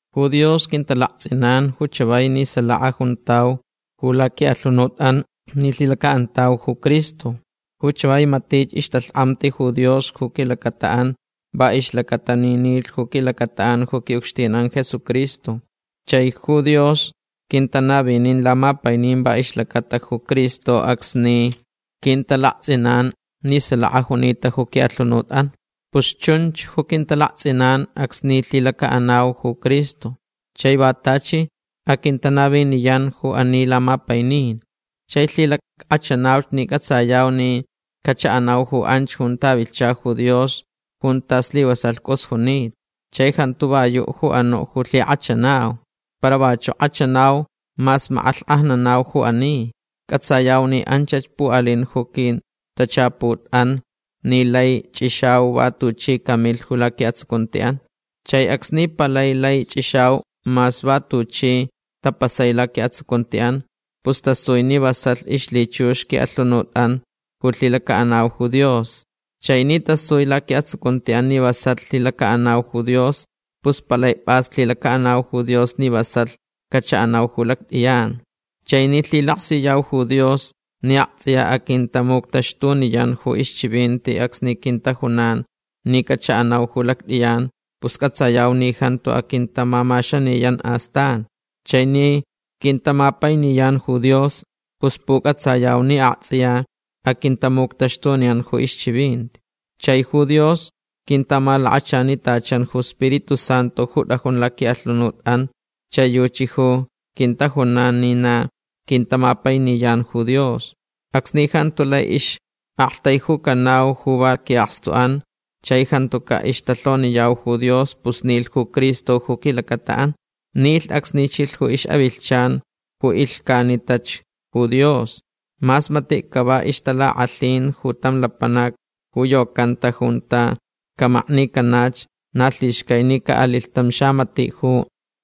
Ju Dios quintalaktsʼinan ju chavai ni salaka juntau ju laquiʼalhunutʼan ni lhilacaʼantauch ju Cristo. Ju chavai matich ixtalhkʼamti ju Dios ju quilacataʼan va ixlacata ni nilhch ju quilacataʼan ju quiʼucxtinʼan Jesucristo. Chai ju Dios quintanavinin lamapainin va ixlacata ju Cristo acsni quintalaktsʼinan ni salaka junita ju quiʼalhunutʼan. Pus chunch ju quintalaktsʼinan acsni lhilacaʼanauch ju Cristo. Chai va tachi aquintanaviniyanch ju ani lamapainin. Chai lhilackʼachanauch ni cʼatsayauch ni cachaʼanau ju anch junta vilhcha ju Dios junta slivasalh cʼus junita. Chai jantu va yuʼ ju anuʼ ju lhikʼachanau. Para vachuʼ kʼachanau mas makʼalhkʼajnanauch ju ani. Cʼatsayauch ni anchach puʼalin ju quintachaputʼan ni lai chʼixau va tuchi camilh ju laquiʼatsucuntiʼan. Chai acsni palai lai chʼixau mas va tuchi tapasai laquiʼatsucuntiʼan pus tasui ni vasalh ixlhichux quiʼalhunutʼan ju lhilacaʼanau ju Dios. Chai ni tasui laquiʼatsucuntiʼan ni vasalh lhilacaʼanau ju Dios pus palai pʼas lhilacaʼanau ju Dios ni vasalh cachaʼanau ju lactʼiyan. Chai ni lhilaksiyau ju Dios ni aktsʼiya aquintamuctaxtuniyan ju ixchivinti acsni quintajunan ni cachaʼanau ju lactʼiyan pus cʼatsayau ni jantu aquintamamaxaniyan astan. Chai ni quintamapainiyan ju Dios pus pucʼatsayau ni aktsʼiya aquintamuctaxtuniyan ju ixchivinti. Chai ju Dios quintamalakachanitachan ju Spiritu Santu ju tʼajun laquiʼalhunutʼan chai yuchi ju quintajunan ni na quintamapainiyan ju Dios. Acsni jantu lai ixʼaktaijucanau ju va quiʼakstuʼan chai jantucaʼ ixtalhoniyau ju Dios pus nilh ju Cristo ju quilacataʼan. Nilh acsni chilh ju ixʼavilhchan ju ilhcanitach ju Dios. Mas matiʼ cava ixtalakʼalhin ju tam lapanac ju yocanta junta camaknicanach na lhixcai ni caʼalilh tam xamatiʼ ju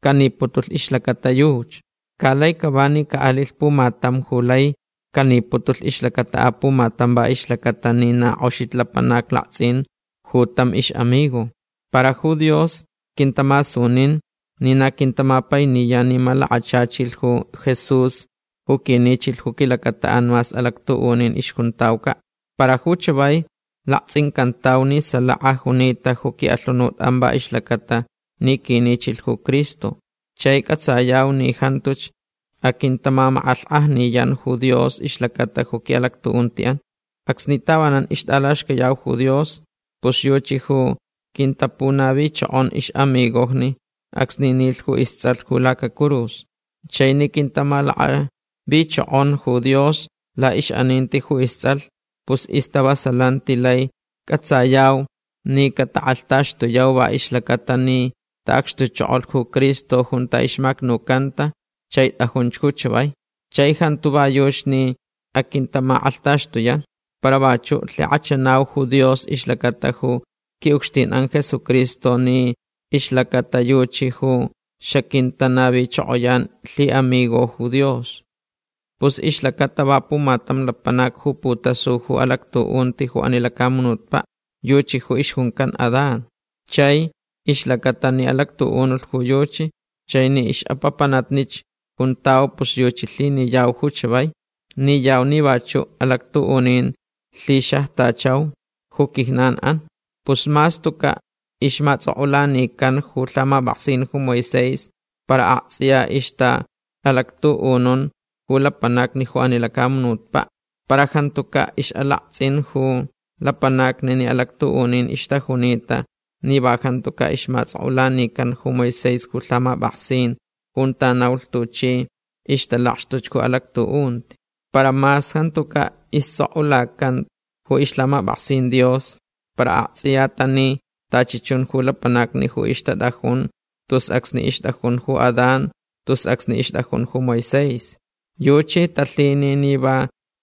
caniputulh ixlacata yuchi. Ca laich cava ni caʼalilh pumatam ju laich caniputulh ixlacata apumatam va ixlacata ni na kʼoxich lapanac laktsʼin ju tam ixʼamigo. Para ju Dios quintamasuninch ni na quintamapainiyan ni malakachachilh ju Jesús ju quinichilh ju quilacataʼan mas alactuʼunin ixjuntaucaʼ. Para ju chavai laktsʼincantauch ni salaka junita ju quiʼalhunutʼan va ixlacaʼatalh ni quinichilh ju Cristo. Chai cʼatsayau ni jantuch aquintamamakʼalhkʼajniyan ju Dios ixlacata ju quiʼalactuʼuntiʼan. Acsni tavanan ixtʼalaxcayau ju Dios pus yuchi ju quintapunavichokon ixʼamigojni acsni nilh ju istsʼalh ju lacacurus. Chai ni quintamalakʼavichokon ju Dios laʼixʼaninti ju istsʼalh pus istavasalanti lai cʼatsayau ni catakʼalhtaxtuyauch va ixlacaʼatalh ni taʼacxtuchokolh ju Cristo junta ixmacnucanta chai tʼajunch ju chavai. Chai jantu va yuchi ni aquintamakʼalhtaxtuyan. Para vachuʼ lhikʼachanauch ju Dios ixlacata ju quiʼucxtinʼan Jesucristo ni laʼixlacata yuchi ju xaquintanavichokoyan lhiʼamigo ju Dios. Pus ixlacata va pumatam lapanac ju putasuta ju alactuʼunti ju ani lacamunutpaʼ. Yuchi ju ixjuncan Adán. Chai ixlacata ni alactuʼunulh ju yuchi chai ni ixʼapapanatnich juntau pus yuchi lhiniyau ju chavai. Niyau ni vachuʼ alactuʼunin lhixajchau ju quijnanʼan. Pus mas tucaʼ ixmatsʼokʼulanican ju lhamapʼaksin ju Moisés para aktsʼiya ixtaʼalactuʼununch ju lapanacni ju ani lacamunutpaʼ. Para jantucaʼ ixʼalaktsʼin ju lapanacni ni alactuʼunin ixtajunita ni va jantucaʼ ixmatsʼokʼulanican ju Moisés ju lhamapʼaksin junta naulh tuchi ixtalakxtuch ju alactuʼunti. Para mas jantucaʼ istsʼokʼulacanta ju ixlhamapʼaksin Dios para aktsʼiya tani tachi chun ju lapanacni ju ixtatʼajun tus acsni ixtʼajun ju Adán tus acsni ixtʼajun ju Moisés. Yuchi talhini ni va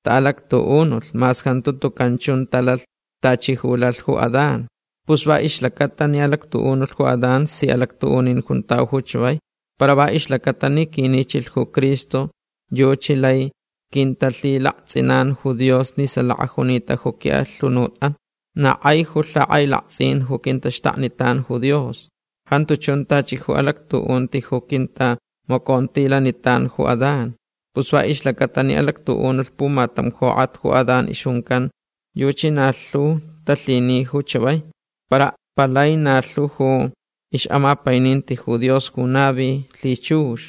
taʼalactuʼunulh mas jantu tucan chun talalh tachi ju lalhch ju Adán. Pus va ixlacata ni alactuʼunulh ju Adán si alactuʼunin juntau ju chavai. Para va ixlacata ni quinichilh ju Cristo yuchi lai quintalhilaktsʼinan ju Dios ni salaka junita ju quiʼalhunutʼan. Na kʼai ju lhakʼailaktsʼin ju quintaxtaknitan ju Dios. Jantu chun tachi ju alactuʼunti ju quintamacontilanitan ju Adán. Pus va ixlacata ni alactuʼunulh pumatam jokʼat ju Adán ixjuncan yuchi na lhu talhini ju chavai. Para palai na lhu ju ixʼamapaininti ju Dios ju navilh lhichux.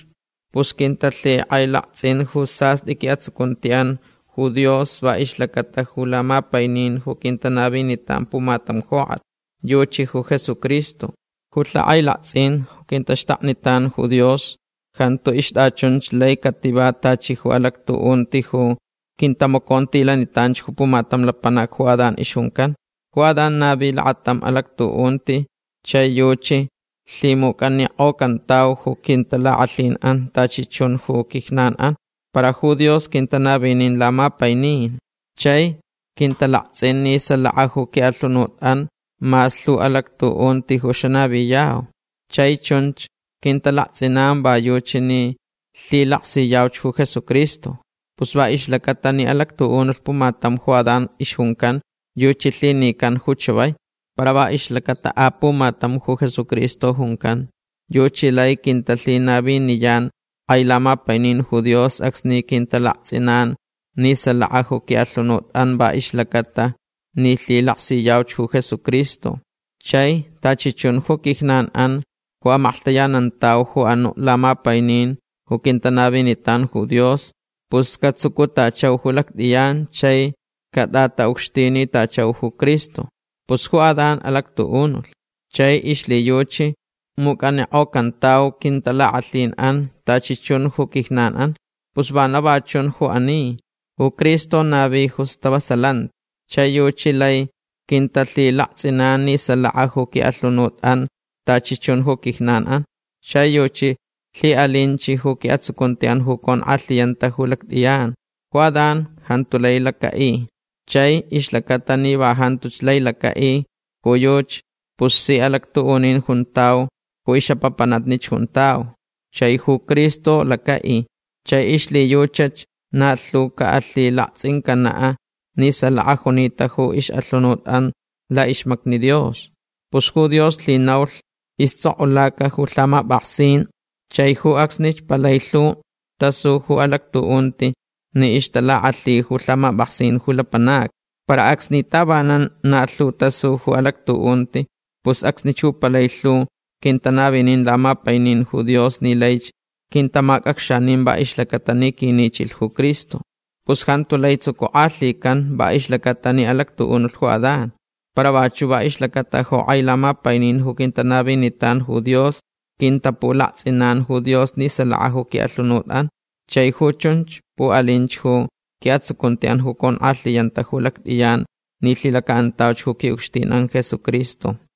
Pus quintalhikʼailaktsʼin ju sastʼi quiʼatsucuntiʼan ju Dios va ixlacata ju lamapainin ju quintanavinitan pumatam jokʼat. Yuchi ju Jesucristo. Ju lhakʼailaktsʼin ju quintaxtaknitan ju Dios jantu ixtʼachunch lai cativa tachi ju alactuʼunti ju quintamacontilanitanch ju pumatam lapanac ju Adán ixjuncan. Ju Adán navilh lakatam alactuʼunti chai yuchi alhimucʼanikʼocantau ju quintalakʼalhinʼan tachi chun ju quijnanʼan. Para ju Dios quintanavinin lamapainin chai quintalaktsʼin ni salaka ju quiʼalhunutʼan mas lhu alactuʼunti ju xanaviyau. Chai chunch quintalaktsʼinan va yuchi ni lhilaksiyauch ju Jesucristo. Pus va ixlacata ni alactuʼunulh pumatam ju Adán ixjuncan yuchi lhinican ju chavai. Para va ixlacata apumatam ju Jesucristo juncan yuchi lai quintalhinaviniyan kʼai lamapainin ju Dios acsni quintalaktsʼinanch ni salaka ju quiʼalhunutʼan va ixlacaʼatalh ni lhilaksiyauch ju Jesucristo. Chai tachi chun ju quijnanʼan ju amaklhtayanantauch ju anuʼ lamapainin ju quintanavinitan ju Dios pus catsucutachau ju lactʼiyan chai catʼataʼucxtinitachau ju Cristo. Pus ju Adán alactuʼunulh. Chai ixlhiyuchi mucʼanikʼocantauch quintalakʼalhinʼan tachi chun ju quijnanʼan. Pus vana va chun ju ani. Ju Cristo navi ju stavasalanti. Chai yuchi lai quintalhilaktsʼinan ni salaka ju quiʼalhunutʼan tachi chun ju quijnanʼan. Chai yuchi lhiʼalinch ju quiʼatsucuntiʼan ju conkʼalhiyanta ju lactʼiyan. Ju Adán jantu lai lacaʼi. Chai ixlacata ni va jantuch lai lacaʼi ju yuchi pus si alactuʼunin juntau ni ixʼapapanatnich juntau. Chai ju Cristo lacaʼi. Chai ixlhiyuchach na lhu caʼalhilaktsʼincanaʼ ni salaka junita ju ixʼalhunutʼan laʼixmacni Dios. Pus ju Dios lhinaulh istsʼokʼulaca ju lhamapʼaksin chai ju acsnich palai lhu tasu ju alactuʼunti ni ixtalakʼalhi ju lhamapʼaksin ju lapanacni. Para acsni tavanan na lhu tasu ju alactuʼunti pus acsnich ju palai lhu quintanavinin lamapainin ju Dios ni laich quintamacʼacxanin va ixlacata ni quinichilh ju Cristo. Pus jantu lai tsucukʼalhican va ixlacaʼatalh ni alactuʼunulh ju Adán. Para vachuʼ va ixlacata ju kʼai lamapainin ju quintanavinitan ju Dios quintapulaktsʼinan ju Dios ni salaka ju quiʼalhunutʼan. Chai ju chunch puʼalinch ju quiʼatsucuntiʼan ju conkʼalhiyanta ju lactʼiyan ni lhilacaʼanauch ju quiʼucxtinʼan Jesucristo.